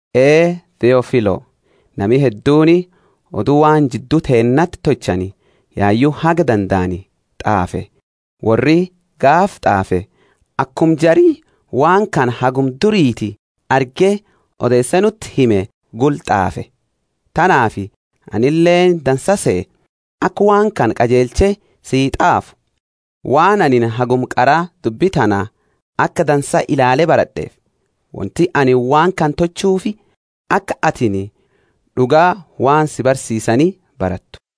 Ee Theofilo: Nami hedduuni odu waan jiddu teennati tolchani yayu haga dandaani t'aafe. Worri, gaafa t'aafe, akuma jari waan kana haguma duriiti arge odeese nuti hime gula t'aafe. Tanaafi anileeni dansa sehe, aka waan kana qajeelche sii t'aafu, waan anini haguma qara dubbi tana aka dansaa ilaale barad'eefi. Wonti anini waan kana tolchuufi aka atini d'uga waan si barsiisani barattu.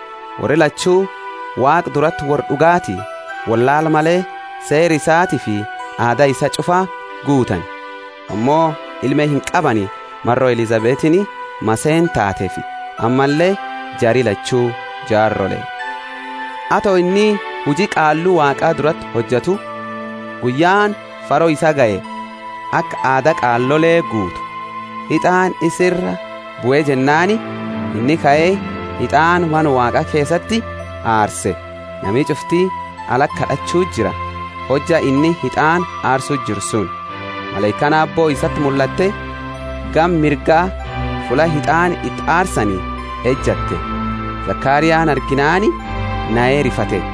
Worri lachu Waaqa durati worra d'ugaati, wollaala male seera isatiifi aada isaa ch'ufa guutani. Ammo ilme inqabani maro Elisabetini maseena taateefi; ammalle jari lachu jaarole. Ato inni huji qaallu Waaqa durati hojatu, guyyaani faro isaa gahe aka aada qaalole guutu. Hit'aani isa ira bue jennaani inni kae hit'aana Mana Waaqa keesati aarse. Nami ch'ufti alati kad'achu jira, hojja inni hit'aana aarsu jiru suni. Malaikaani aabbo isati mullatte, gama mirga fulla hit'aana iti aarsani ejatte. Zekariani arginaani nahe rifate.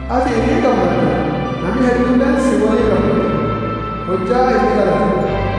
Atini ingammadda, nami hedduleeni si woliini gammada, hojja inni d'alatu.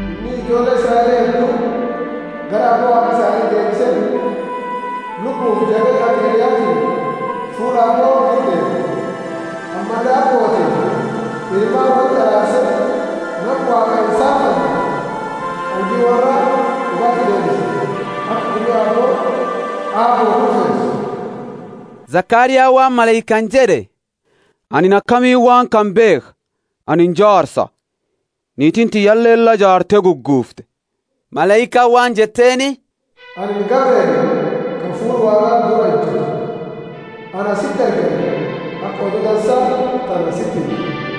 Inni ijoolle Israeli heddu gara Aabbo Waaqa isaani deebise, Lubbufi jabeenna aka Eliyatini fuula Aabbo dura deema. Ammalle abbootifi ilmaani wolti araarse, nama Waaqaa insaalfane qalbi worraa d'ugaati deebisa aka gumi Aabbo Aabboo kurfeesu. Zekariani waan malaikaani jed'e, Anini akamiini waan kana beekha? Anini jaarsa, niitiini tiyyaleeni la jaarte guguufte. Malaikaani waan jetteeni, Anini Gabrieli, ka fuula Waaqa dura ejatu, ana siti ergani aka odu dansa tana siti himu.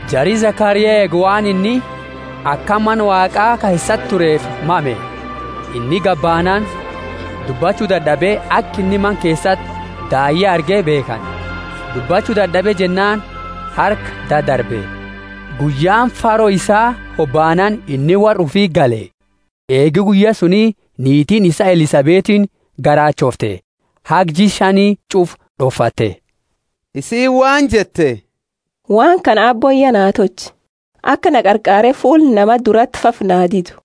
Jari Zekaria eegu waan inni akana Mana Waaqa keesati tureefi mame. Inni gabaanaani dubbachu dad'abe, aka inni Mana keesati daayya arge beekhani. Dubbachu dad'abe jennaani harka dadarbe. Guyyaani faro isaa hobaanaani inni worra ufiti gale. Eegi guyya suni niitiini isaa Elisabetiini garaachoofte, haga jia shani ch'ufa d'ofatte. Isiini waan jette, Waan kana Aabbooni ya naa tolche, aka na qarqaare fuula nama durati fafa naa didu.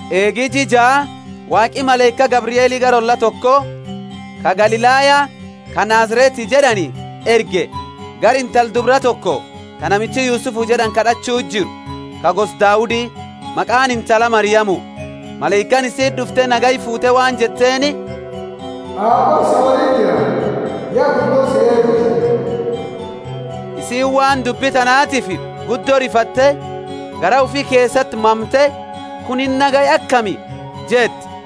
Eegi jia jaa Waaqi malaika Gabrieli gara olla toko ka Galilaya, ka Nazareti jed'ani, erge gara intala dubra toko ta namichi Yusufu jed'ani kad'achu jiru, ka gosa Daudi, maqaani intala Mariamu. Malaikaani isiti d'ufte nagaya fuute waan jetteeni, Aabbooni si woliini jira, ya guddo si eebise. Isiini waan dubbi tanaatiifi guddo rifatte, garaa ufi keesati, mamte Kunini nagaya akami? jette.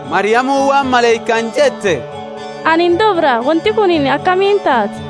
Mariamuni waan malaikaani jette, Anini dubra. Wonti kunini akamiini taati?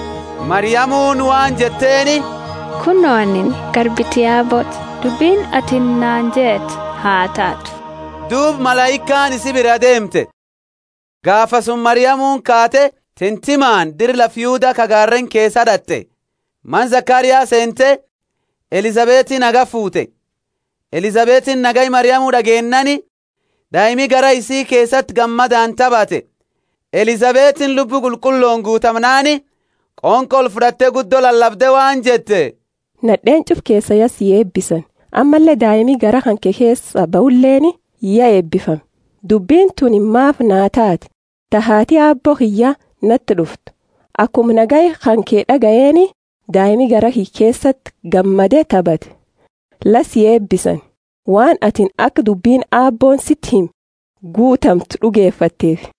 Mariamuni waan jetteeni, Kuno, anini garbiti Aabbooti, dubbini atini naani jette ha taatu. Duuba malaikaani isi biraa deemte. Gaafasuma Mariamuni kaate titimaani dira lafa Yuda ka gaareeni keesa d'at'e. Mana Zekaria seente, Elisabeti nagaya fuute. Elisabetiini nagaya Mariamu d'ageennaani, daimi garaa isii keesati gammadaani tabate. Elisabetiini Lubbu Qulqullooni guutamnaani qonqo olfud'atte guddo lalabde waan jette, Nad'eeni ch'ufa keesa ya si eebisani, ammalle daimi garaa kanke keesaa bahuleeni ya eebifame. Dubbini tuni maafi naa taate, ta haati Aabbo kiyya nati d'uftu? Akuma nagaya kanke d'agayeeni, daimi garaa kiyya keesati gammade tabate. La si eebisani, waan atini aka dubbini Aabbooni siti hime guutamtu d'ugefatteefi.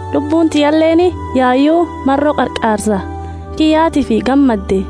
lubbuuni tiyyaleeni yayu maro Qarqaarsa kiyyatiifi gammadde.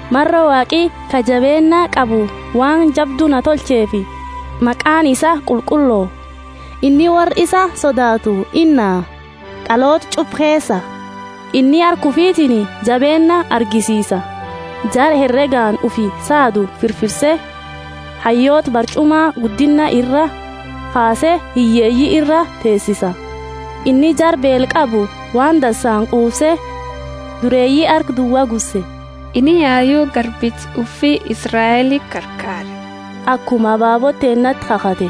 maro Waaqi ka jabeenna qabu waan jabdu na tolcheefi. Maqaani isaa qulqullo; inni worra isa sodaatu inaha, d'aloota ch'ufa keesa. Inni harka ufitiini jabeenna agarsiise jara heregaani ufi saadu firfirse. Hayyoota barch'uma guddinna iraa kaase hiyyeeyi ira teteesise, inni jara beela qabu waan dansaani quufse, dureeyi harka duwa gusse. Inni yayu garbicha ufi Israeli qarqaare, akuma ababoota teennati kakhate,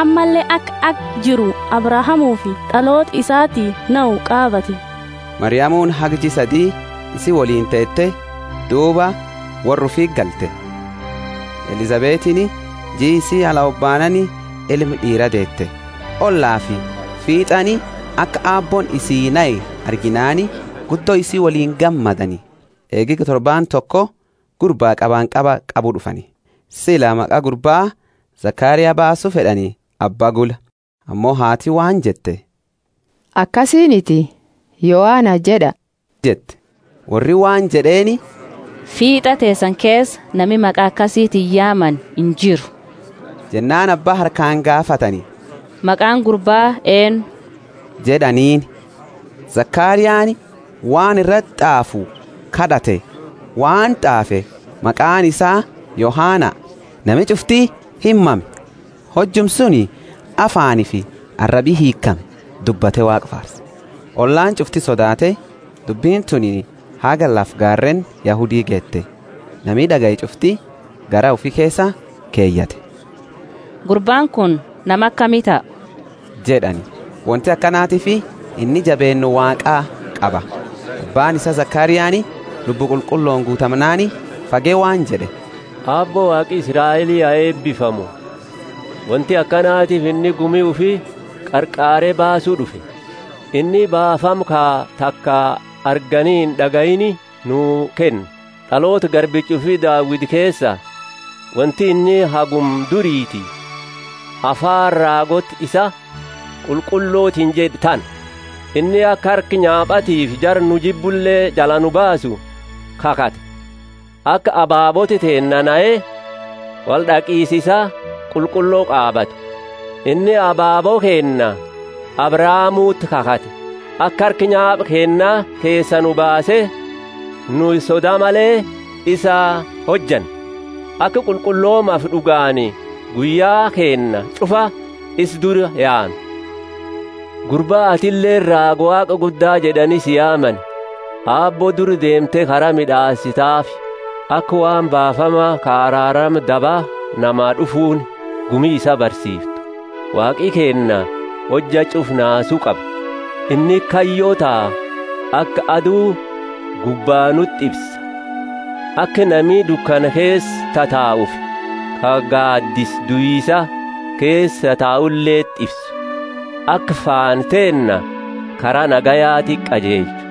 ammalle aka haga jiru Abrahamufi d'aloota isaati nahu qaabate. Mariamuni haga jia sadi isi woliini teete duuba worra ufiti galte. Elisabetini jii isii hobaanaani ilma d'iira deete. Ollafi fiit'ani aka Aabbooni isii nahe arginaani guddo isi woliini gammadani. Eegi torbaani toko gurbaa qabanqaba qabu d'ufani; sila maqa gurbaa Zekaria baasu fed'ani abba gula. Ammo haati waan jette, Akasiniti, Yohana jed'a jette. Worri waan jed'eeni, Fiit'a teesani keesa nami maqa akasitini yaamani injiru. Jennaani abba harkaani gaafatani, Maqaani gurba eennu? jed'aniini. Zekariani waan irati t'aafu kad'ate waan t'aafe, Maqaani isaa Yohana. Nami ch'ufti imame. Hojuma suni afaanifi arabi hiikhame, dubbate Waaqa faarse. Ollaani ch'ufti sodaate, dubbini tuni haga lafa gaareeni Yahudi geete. Nami d'agaye ch'ufti garaa ufi keesa keyate, Gurbaani kuni nama akami taha? jed'ani. Wonti akanatiifi inni jabeenna Waaqa qaba. Abbaani isaa Zekariani Lubbu Qulqullooni guutamnaani fage waan jed'e, Aabbo Waaqi Israeli ha eebifamu: Wonti akanatiifi inni gumi ufi qarqaare baasu d'ufe. Inni baafama ka taka argani ind'agayiini nuu kenne, d'aloota garbicha ufi Daudi keesa. Wonti inni haguma duriiti afaani raagoota isaa qulqullotiini jed'e tana: Inni aka harka nyaapatiifi jara nuu jibbule jala nu baasu kakhate. Aka ababoota teennaa nahe wold'aqisa isaa qulqullo qaabatu. Inni abaabo keenna Abrahamuti kakhate, aka harka nyaapa keenna keesaa nu baase, nu soda male isa hojannu. Aka qulqulloomafi d'ugaani guyya keenna ch'ufa isa dura yaanu. Gurba, atileeni raaga Waaqa Gudda jed'ani si yaamani; Aabbo dura deemte kara mid'aasitaafi. Aka waan baafama, ka araarama daba namaa d'ufuuni, gumi isaa barsiiftu. Waaqi keenna hojja ch'ufa naasu qaba; inni kayyo ta aka adu gubba nuti ifsa, Aka nami dukana keesa tataufi ka gaadisa duisa keesa tatuleti ifsu, aka faana teenna kara nagayaati qajeelchu.